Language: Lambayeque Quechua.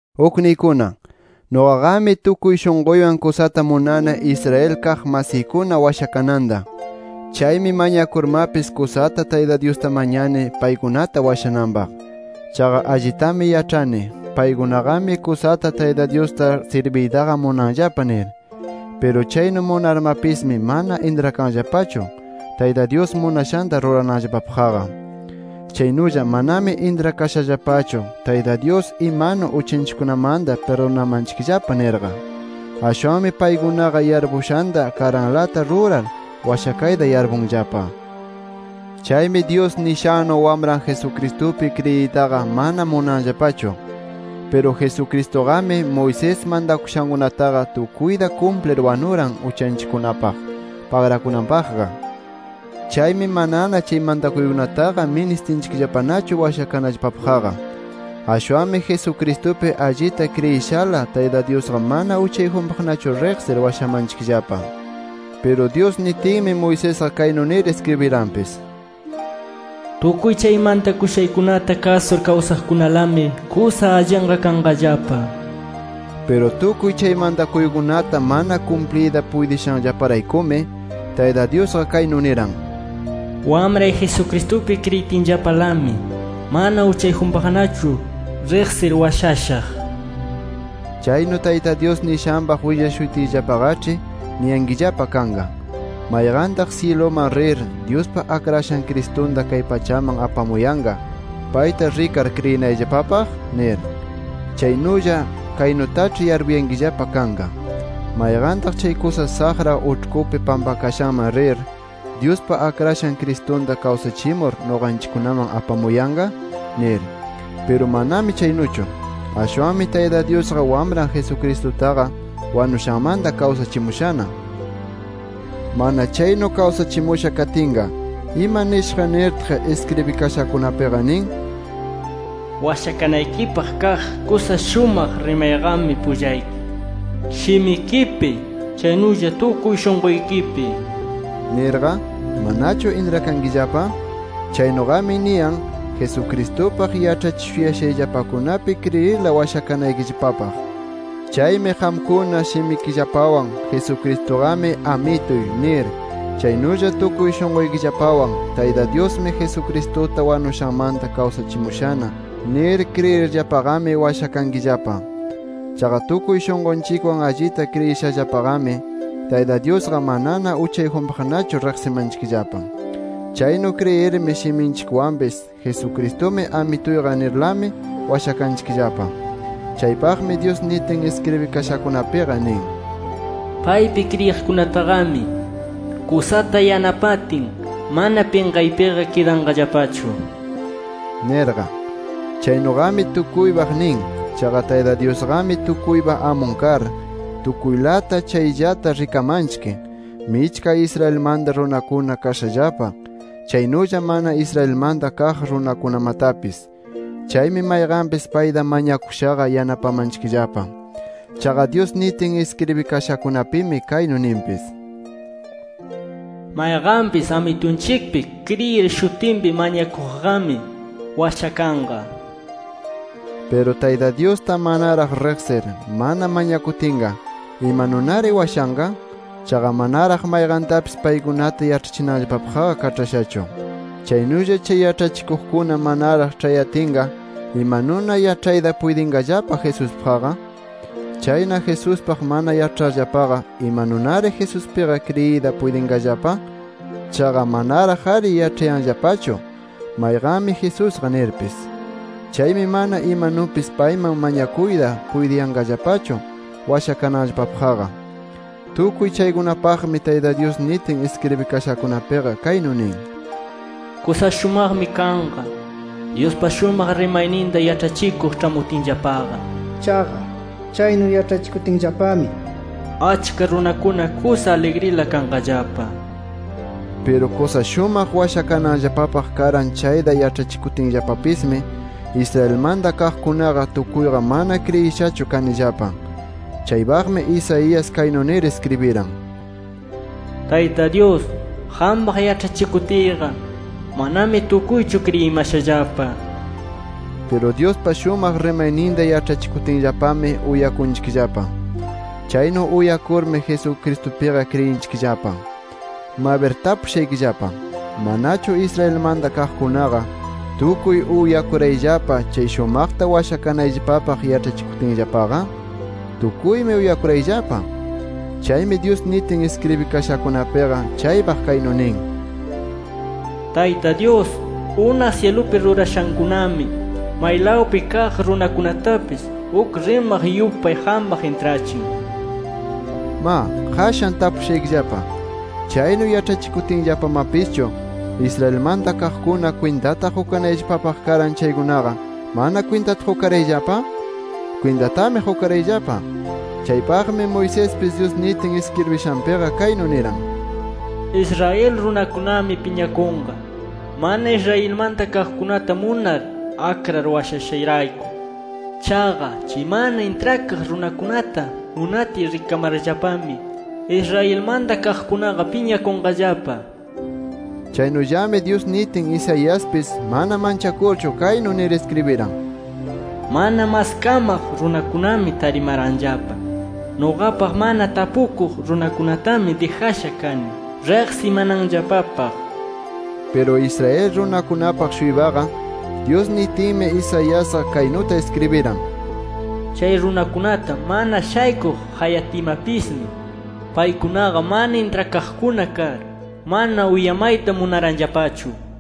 Ukniykuna, nuqaqami tukuy shunquywan kusata munani Israel kaq masiykuna washakananta. Chaymi mañakurmapis, kusata Tayta Dyusta mañani paykunata washananpaq. Chaqa allitami yaĉhani, paykunaqami kusata Tayta Dyusta sirbiytaqa munanllapa nir. Piru chaynu munarmapismi, mana intrakanllapachu Tayta Dyus munashanta rurananllapapaqqa. Chaynulla manami intrakashallapachu Tayta Dyus imanu uchanchikkunamanta pirdunamanchikllapa nirqa. Ashwanmi paykunaqa yarpushanta karanlata rurar washakayta yarpunllapa. Chaymi Dyus nishannu Wamran Jesucristupi kriyiytaqa mana munanllapachu. Piru Jesucristuqami, Moisés mantakushankunataqa tukuyta kumplir wanuran, uchanchikkunapaq pagrakunanpaqqa. Chaymi manana chay mantakuykunataqa ministinchikllapanachu washakanallapapaqqa. Ashwanmi Jesucristupi allita kriyishala, Tayta Dyusqa mana uchayjunpaqnachu riqsir washamanchikllapa. Piru Dyus nitinmi Moisesqa kaynu nir iskribiranpis: “Tukuy chay mantakushaykunata kasur kawsaqkunalami kusa allinqa kanqallapa” nir. Piru tukuy chay mantakuykunata mana kumpliyta puytishanllaparaykumi, Tayta Dyusqa kaynu niran: “Wamray Jesucristupi kriyitinllapalami, mana uchayjunpaqnachu riqsir washashaq” nir. Chaynu Tayta Dyus nishanpaq willashutiyllapaqaĉhi niyankillapa kanqa: ¿Mayqantaq syiluman rir Dyuspa Akrashan Cristunta kay pachaman apamuyanqa, payta rikar kriyinallapapaq? nir. Chaynulla kaynutaĉhi yarpuyankillapa kanqa “¿Mayqantaq chay kusa saqra uĉhkupi pampakashanman rir, Dyuspa Akrashan Cristunta kawsachimur nuqanchikkunaman apamuyanqa?” nir. ¡Piru manami chaynuchu! Ashwanmi Tayta Dyusqa, Wamran Jesucristutaqa wanushanmanta kawsachimushana. Mana chaynu kawsachimusha katinqa ¿ima nishaq nirtaq iskribikashakunapiqa nin: “Washakanaykipaq kaq kusa shumaq rimayqami pullayki, shimikipi, chaynulla tukuy shunquykipi” nirqa? ¿Manachu intrakankillapa? Chaynuqami niyan Jesucristupaq yaĉhachishuyashayllapakunapi kriyirla washakanaykillapapaq. Chaymi qamkuna, shimikillapawan “Jesucristuqami Amituy” nir, chaynulla tukuy shunquykillapawan “Tayta Dyusmi Jesucristuta wanushanmanta kawsachimushana” nir kriyirllapaqami, washakankillapa. Chaqa tukuy shunqunchikwan allita kriyishallapaqami, Tayta Dyusqa manana uchayjunpaqnachu riqsimanchikllapa. Chaynu kriyirmi, shiminchikwanpis “Jesucristumi Amituyqa” nirlami washakanchikllapa. Chaypaqmi Dyus nitin iskribikashakunapiqa nin: “Paypi kriyiqkunataqami, kusata yanapatin mana pinqaypiqa kidanqallapachu” nirqa. Chaynuqami tukuypaq nin. Chaqa Tayta Dyusqami tukuypa amun kar, tukuylata chayllata rikamanchik, michka Israelmanta runakuna kashallapa, chaynulla mana Israelmanta kaq runakunamatapis. Chaymi mayqanpis payta mañakushaqa yanapamanchikllapa. Chaqa Dyus nitin iskribikashakunapimi kaynu ninpis: “Mayqanpis Amitunchikpi kriyir shutinpi mañakuqqami, washakanqa” nir. Piru Tayta Dyusta manaraq riqsir, mana mañakutinqa, ¿imanunari washanqa? Chaqa manaraq mayqantapis paykunata yaĉhachinanllapapaqqa kaĉhashachu. Chaynulla chay yaĉhachikuqkuna manaraq ĉhayatinqa, ¿imanuna yaĉhayta puytinqallapa Jesuspaqqa? Chayna Jesuspaq mana yaĉharllapaqa, ¿imanunari Jesuspiqa kriyiyta puytinqallapa? Chaqa manaraq-ari yaĉhayanllapachu mayqanmi Jesusqa nirpis. Chaymi mana imanupis payman mañakuyta puytiyanqallapachu washakananllapapaqqa. Tukuy chaypaqmi Tayta Dyus nitin iskribikashakunapiqa kaynu nin: “Kusa shumaqmi kanqa, Dyuspa shumaq rimayninta yaĉhachikuq ĉhamutinllapaqa. Chaqa chaynu yaĉhachikutinllapami, achka runakuna kusa aligrila kanqallapa” nir. Piru kusa shumaq washakananllapapaq karan chayta yaĉhachikutinllapapismi, Israelmanta kaqkunaqa tukuyqa mana kriyishachu kanillapa. Chaypaqmi Isaías kaynu nir iskribiran: “Tayta Dyus, qampaq yaĉhachikutiyqa, manami tukuychu kriyimashallapa” nir. Piru Dyuspa shumaq rimayninta yaĉhakutinllapami uyakunchikllapa. Chaynu uyakurmi Jesucristupiqa kriyinchikllapa. Mabir tapushaykillapa: ¿Manachu Israelmanta kaqkunaqa tukuy uyakurayllapa chay shumaqta washakanayllapapaq yaĉhachikutinllapaqa? Tukuymi uyakurayllapa. Chaymi Dyus nitin iskribikashakunapiqa chaypaq kaynu nin: “Tayta Dyus unaq syilupi rurashankunami, maylawpi kaq runakunatapis uk rimaq yupay qampaq intrachin” nir. Ma, qashan tapushaykillapa: ¿Chaynu yaĉhachikutinllapamapischu, Israelmanta kaqkuna kwintata qukanayllapapaq karan chaykunaqa, mana kwintata qukarayllapa? ¡Kwintatami qukarayllapa! Chaypaqmi Moisespis Dyus nitin iskribishanpiqa kaynu niran: “Israel runakunami piñakunqa, mana Israelmanta kaqkunata munar akrar washashayrayku. Chaqa chay mana intrakaq runakunata munatiy rikamarllapami, Israelmanta kaqkunaqa piñakunqallapa” nir. Chaynullami Dyus nitin Isaiaspis mana manchakurchu, kaynu nir iskribiran: “Mana maskamaq runakunami tarimaranllapa. Nuqapaq mana tapukuq runakunatami dijasha kani riqsimananllapapaq” nir. Piru Israel runakunapaq-shuypaqa, Dyus nitinmi Isaiasqa kaynuta iskribiran: “Chay runakunata mana shaykuq qayatiymapismi, paykunaqa mana intrakaqkuna kar, mana uyamayta munaranllapachu” nir.